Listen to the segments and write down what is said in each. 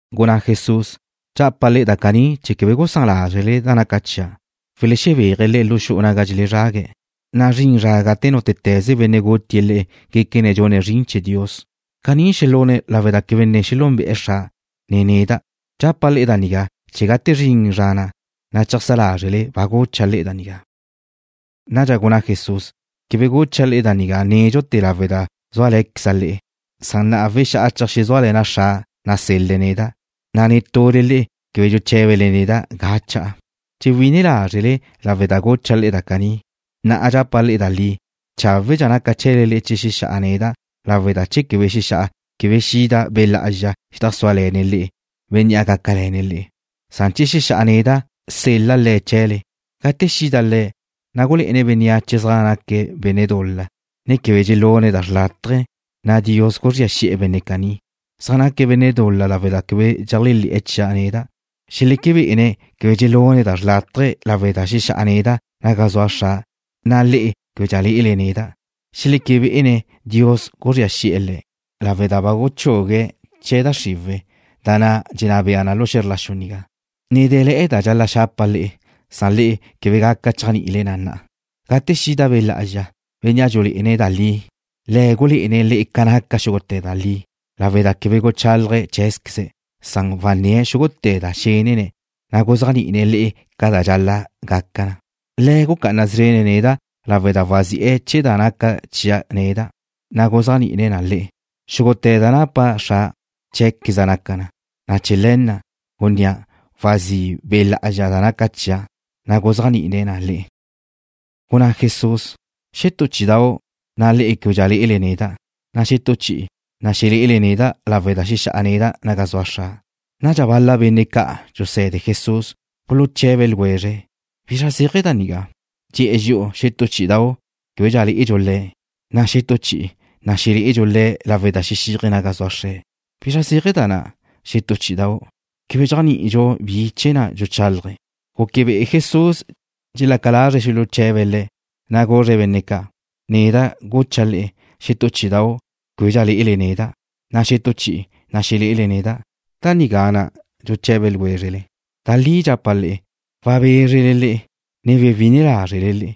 Gunná Jesús: ―Dxapa' le'e da caní chee̱ quebe gusán lázrele da naca chia'. Welexebéaje̱' le'e lu xu'u naga dxelezrague̱', na' zrin zra gate nútete̱ze benne' gutie̱' le'e guéquene̱' gune̱' zrin chee̱ Dios. Caní xelune̱' lawe' da quebe ne xelúnbe'e̱ Xra', ne neda'. Dxapa' le'e da nigá chee̱ gate zrin zra na', na' cheajsá lázrele ba gucha' le'e da nigá. Nadxa gunná Jesús: ―Quebe gucha' le'e da nigá nédxute̱ lawe' da zúale̱queza' le'e. Na'a wexá'a cheajxezúale̱na' Xra' nasel-le̱' neda', na' netule le'e quebe dxuché̱bele neda' ga cha'a. Dxewí'ine lázrele lawe' da gucha' le'e da caní. Na'a dxapa' le'e da li: Cháwe'dxa gaca chee̱le le'e che xexá'a neda' lawe' da che quebe xexá'a, quebe xida Be' Lá'azxa xedajsúale̱ne̱' le'e, Bénnea' gácale̱ne̱' le'e. Che xexá'a neda', sel-la' Le̱' chee̱le. Gate xida Le̱', na' gulé'ene̱' bénneache zaj naque̱' benne' dul-la, ne quebe dxelune̱' da xrlátaje, na' Dios guzría xi'e̱ benne' caní. Zaj naque̱' benne' dul-la lawe' da quebe dxeléajle̱'e̱ chia' neda'. Xeleque bé'ene̱' quebe dxelune̱' da xrlátaje lawe' da xexá'a neda' naga zua Xra', na' le'e québedxa lé'ele neda'. Xeleque bé'ene̱' Dios guzría xi'e̱ le̱' lawe' da ba guchugue̱' chee̱ da xriwe̱', da na' dxenná bea na lu xe̱zr la xu nigá. ’Ne dé̱le̱'e̱ da dxal-la' xapa' le'e, san le'e quebe gaca chéajni'ile na na'a. Gate xida Be' Lá'azxa, Bénnea' dxulé'ene̱' da li, Le̱' gulé'ene̱' le'e ca naca xúgute̱ da li lawe' da quebe guchálaje̱' cheé̱zqueze̱'. Wanné̱' xúgute̱ da xénene̱', na' guzéajni'ine̱' le'e ca da dxal-la' gaca na. Le̱' gucá'ana szrene̱' neda' lawe' da wazi'e̱ chee̱ da naca chia' neda', na' guzéajni'ine̱' na le'e. Xúgute̱ da napa Xra', cheé̱queza' naca na, na' chee̱ le̱ na' gunnéa', wazí' Be' Lá'azxa da naca chia', na' guzéajni'ine̱' na le'e. Gunná Jesús: ―Xetú chí'idau', na' le'e québedxa lé'ele neda', na' xetú chi'i, na' xelé'ele neda' lawe' da xexá'a neda' naga zua Xra'. Nadxa bal-la benne' ca' dxuse̱de Jesús buluche̱be ljwezre̱': ―¿Bizra zéaje̱ da nigá? Dxe̱'e̱ dxi'u, xetú chí'idau' québedxa lé'edxu Le̱', na' xetú chi'i, na' xelé'edxu Le̱' lawe' da xexíaje̱' naga zua Xre̱'. ¿Bi zéaje̱ da na', xetú chí'idau'? Quebe dxéajni'idxu bi chee̱ dxuchálaje̱'. Guque be'e Jesús dxelaca lazre̱' xuluche̱be̱' Le̱', na' guzre̱' benne' ca': ―Neda' gucha' le'e, xetú chí'idau' québedxa lé'ele neda', na' xetú chi'i, na' xelé'ele neda'. ¿Da nigá na' dxuche̱be ljwézrele? Da li dxapa' le'e, wabézrele le'e, ne xewi'ine lázrele,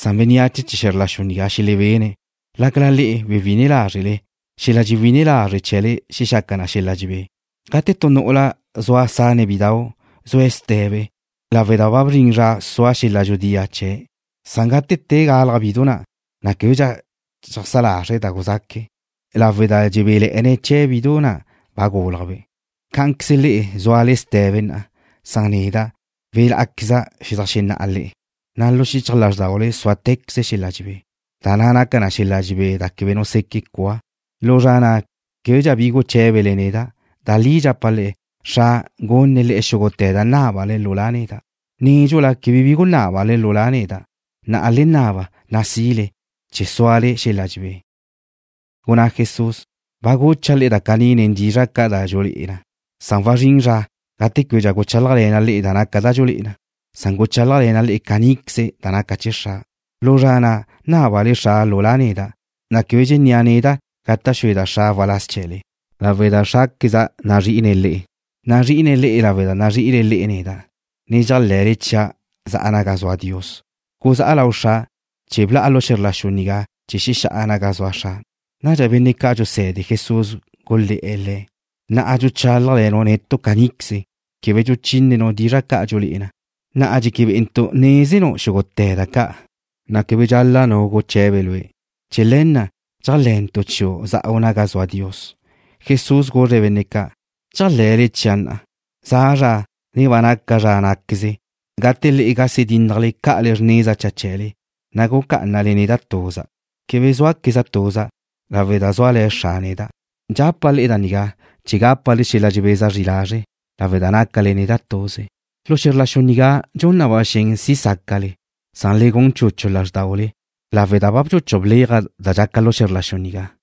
san bénneache chee̱ xe̱zr la xu nigá xelebene̱'. Lácala le'e xewi'ine lázrele, xel-la' dxewí'ine lazre' chee̱le xexaca na xel-la' dxebé. Gate tu nu'ula zua sane̱' bidau' zue̱' ste̱be lawe' da ba bzrin zra sua xel-la' dxudía chee̱'. Gate te galaj bidu na', na' québedxa dxeajsá lazre̱' da guzaque̱' lawe' da dxebéle̱'e̱ne̱' chee̱ bidu na' ba gúlajbe'. Cá'anqueze le'e zúale ste̱be na'a, san neda' welá'queza' xedajxenná'a le'e, na' lu xichaj lázrdaule súate̱queze xel-la' dxebé, da naca na tu xel-la' dxebé da quebe nu seque' cua. ’Lu zra na' québedxa bi guché̱bele neda'. Da li dxapa' le'e, Xra' gunne̱' le'e xúgute̱ da nábale lu La' neda'. Nédxula quebe bi gunábale lu La' neda'. Na'a le naba, na' si'le, chee̱ súale̱'e̱le xel-la' dxebé. Gunná Jesús: ―Ba gucha' le'e da caní nen dizra' ca' da dxululé'e na. Wazrín zra gate québedxa guchálajle̱na' le'e da naca da dxulé'e na. Guchálajle̱na' le'e caníqueze da naca chee̱ Xra'. Lu zra na' nábale Xra' lu La' neda', na' quebe dxennéa' neda' gata' xueda' Xra' waláz chee̱le, lawe' da Xrá'queze nazrí'ine̱' le'e. Nazrí'ine̱' le'e lawe' da nazrí'ile le'e neda', ne dxéajle̱le chia' za'a naga zua Dios. Guzá'a lau Xra' chee̱ bla'a lu xe̱zr la xu nigá chee̱ xexá'a naga zua Xra'. Nadxa benne' ca' dxuse̱de Jesús gulé̱'e̱ Le̱': ―Na'a dxuchálajle̱nu' netu' caníqueze. Quebe dxuchínenu' dizra' ca' da dxululé'e na. Na'a dxeque bé'entu' nézenu' xúgute̱ da ca', na' quebe dxal-la' nu guche̱be Lue'. Chee̱ le̱ na' dxéajle̱ntu' chiu' za'u naga zua Dios. Jesús guzre̱' benne' ca': ―¿Dxéajle̱le chia' na'a? Za' zra, ne ba naca zra ná'queze gate le'e gase dínnajle ca'ale xrneza cha chee̱le, na' gucá'anale neda' tuza'. Quebe zúaqueza' tuza' lawe' da zúale̱ Xra' neda'. Dxapa' le'e da nigá chee̱ gápale xel-la' dxebeza zri lazre' lawe' da nácale neda' tuze. Lu xe̱zr la xu nigá dxun na ba xen si sácale. Le gun chuchu lázrdaule, lawe' da ba bchuchuj bléaja' da dxaca lu xe̱zr la xu nigá.